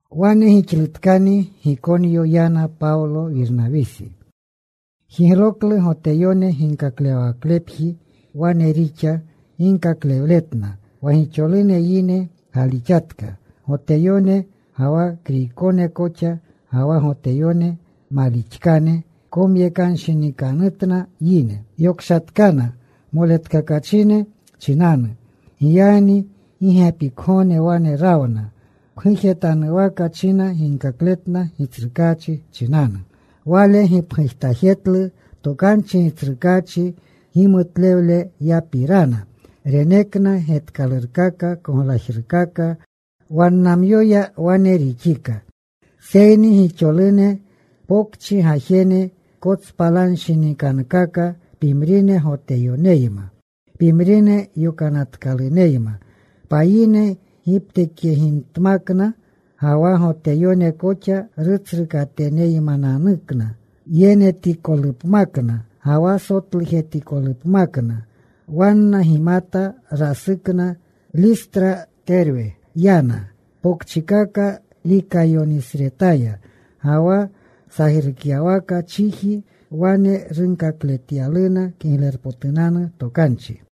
Wane gixlutkani Gikonyo yana. Pawlo, Wirnawisi jigloklu Goteyone ginkaklewawaklepji. Wane rixa ginkaklewletna wa gixolune yine galixatka, Goteyone ga wa Kriykone koxa. Ga wa Goteyone malixkane komyekanshinikanutna yine. Yokshatkana moletkakachine chinanu. Giyagni gi gepikgogne wane rawna. Pgujetanuwaka china ginkakletna Gitsrukaachi chinanu. Wale gipgujtajetlu tokanchi Gitsrukaachi gimutlewleyapirana. Renekna getkalurkaka, koglajrukaka. Wannamyoya wane rixika. Seyni gixolune pokchi gajene kotspalanshinikankaka: pimrine Goteyoneyma, pimrine yokanatkaluneyma. Payine giptekyegimtmakna ga wa Goteyone koxa, rutsrukateneymananukna. Yenetikolupmakna ga wa sotlujetikolupmakna. Wanna gimata. Rasukna. Listra, Terwe yana, pokchikaka Likayonisretaya ga wa sajrukyawaka chiji. Wane runkakletyaluna Kiglerpotunanu Tokanchi.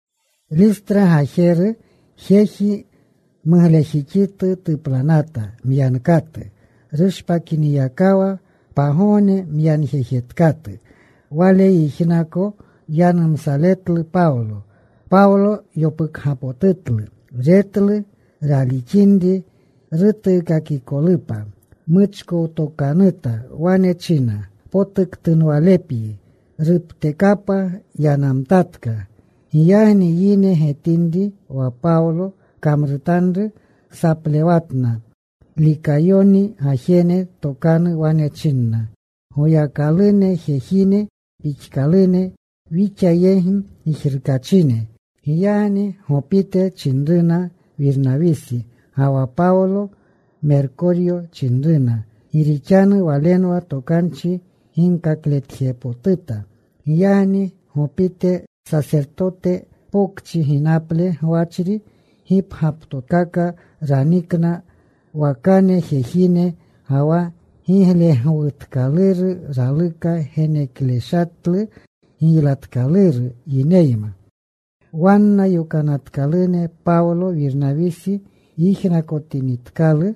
Listra gajeru jeji muglejixitu tuplanata, myankatu rushpakinyakawa. Pagogne myanjejetkatu. Wale yijnaka yanumsaletlu Pawlo. Pawlo yopukgapotutlu. Retlu ralixinri rutuukakikolupa. Muchkowtokanuta. Wane china, “Palnanu. Potuktunwalepyi.” Ruptekapa. Yanamtatka. Giyagni yine getinri wa Pawlo kamrutanru, saplewatna. Likayoni gajene tokanu wane chinna, “Goyakalune, jejine pixkalune wixa yegi gijrukachine.” Giyagni Gopite chinruna Wirnawisi, ga wa Pawlo Merkoryo chinruna, gi rixanu walenwa tokanchi ginkakletjepotuta. Giyagni Gopite sasertotete pokchi ginaple gwachri, gipgyaptokaka ranikna wakane jejine ga wa giglegwutkaluru. Raluka genekashletlu giylatkaluru yineyma. Wanna yokanatkalune Pawlo, Wirnawisi yijnakotinitkalu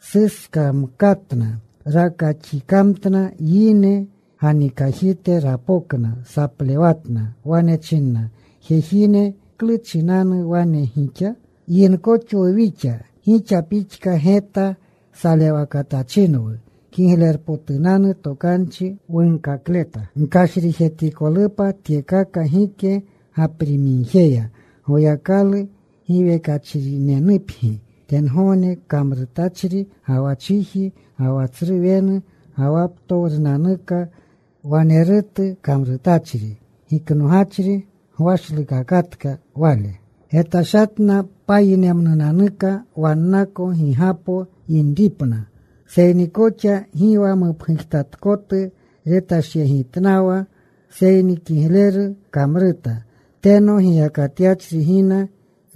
suskakamkatna. Rakaxikamtna. Yine ganikajite rapokna. Saplewatna. Wane chinna, “Jejine, ¿klu chinanu wane gixa? Yinkoxwu wixa. Gixa pixka geta salewnaletachinwu. Kiglerpotunanu Tokanchi wunkakleta gkashrijetikolupa tyekaka gike gaprimigjeya. Goyakalu giwekachrinunepgi. Tengogne kamrutachri, ga wa chiji, ga wa tsru wenu, ga wa ptowrunanuka wanerutu kamrutachri. Giknogachri gwashlukakatka Wale getashatna payinemnunanuka wannako gigapo yapinripna. Seyni koxa gi wa mupgujtatkotu retashyegitnawa. Seyni kigleru kamruta. Teno giyakatyachri gina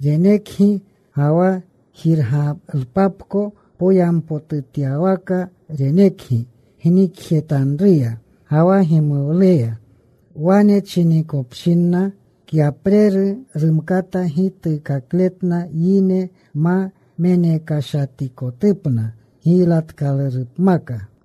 renekgi, ga wa jirgalupapko. Poyampotutyawaka renekgi gnikjetanruya, ga wa gimuwleya.” Wane chinikopshinna kyapreru rumkata gituukakletna yine ma menekashatikotupna giylatkalurupmaka.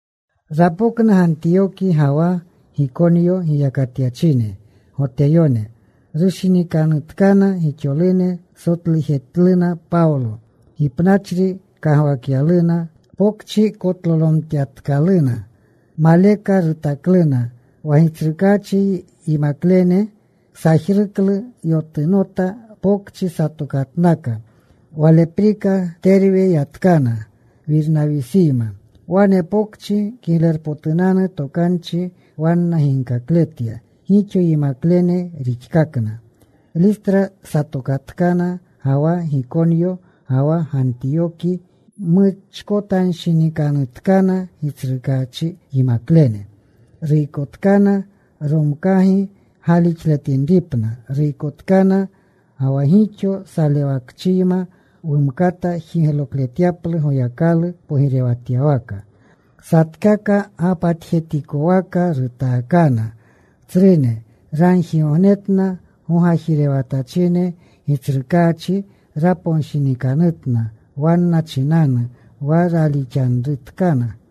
Rapokna Gantiyoki ga wa Gikonyo giyakatyachine Goteyone. Rushinikanutkana gixolune. Sotlujetluna Pawlo. Gipnachri kagwakyaluna. Pokchi kotlolomtyatkaluna. Maleka rutakluna. Wa Gitsrukaachi yimaklene sajruklu. Yotunota. Pokchi satokatnaka. Waleprika Terwe yatkana Wirnawisiyma. Wane pokchi Kiglerpotunanu Tokanchi wanna ginkakletya. Gixo yimaklene rixkakna. Listra satokatkana, ga wa Gikonyo, ga wa Gantiyoki. Muchkotanshinikanutkana Gitsrukaachi yimaklene. Ruykotkana romkaga galixletinripna. Ruykotkana wa gixo salewakchiyma wumkata jiglokletyaplu Goyakalu pogirewatyawaka. Satkaka gapatjetikwaka rutaakana tsrune. Ragjigognetna gogajirewatachine. Gitsrukaachi raponshinikanutna wanna chinanu, wa ralixanrutkana.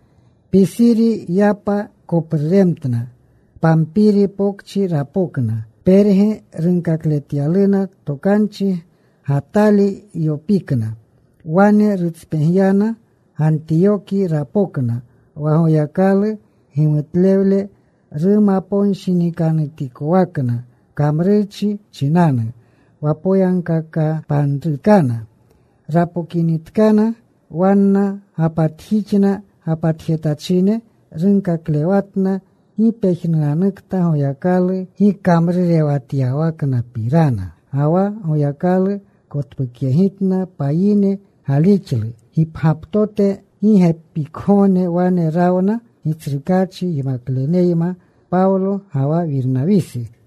Pisiri yapa kopruremtna. Pampiri Pokchi rapokna. Perge runkakletyaluna tokanchi. Gatali yopikna. Wane rutspegyana. Gantiyoki rapokna, wa Goyakalu gimutlewle rumaponshinikanutikowakna kamrurchi chinanu, wa poyagkakapanrutkana. Rapokinitkana, wanna gapatjixna gapatjetachine. Runkaklewatna gi pejnunanukta Goyakalu gikamrurewatyawaknapirana, ga wa Goyakalu kotpukyegitna payine galixlu gipgyaptote. Gi gepikgogne wane rawna Gitsrukaachi yimakleneyma Pawlo ga wa Wirnawisi.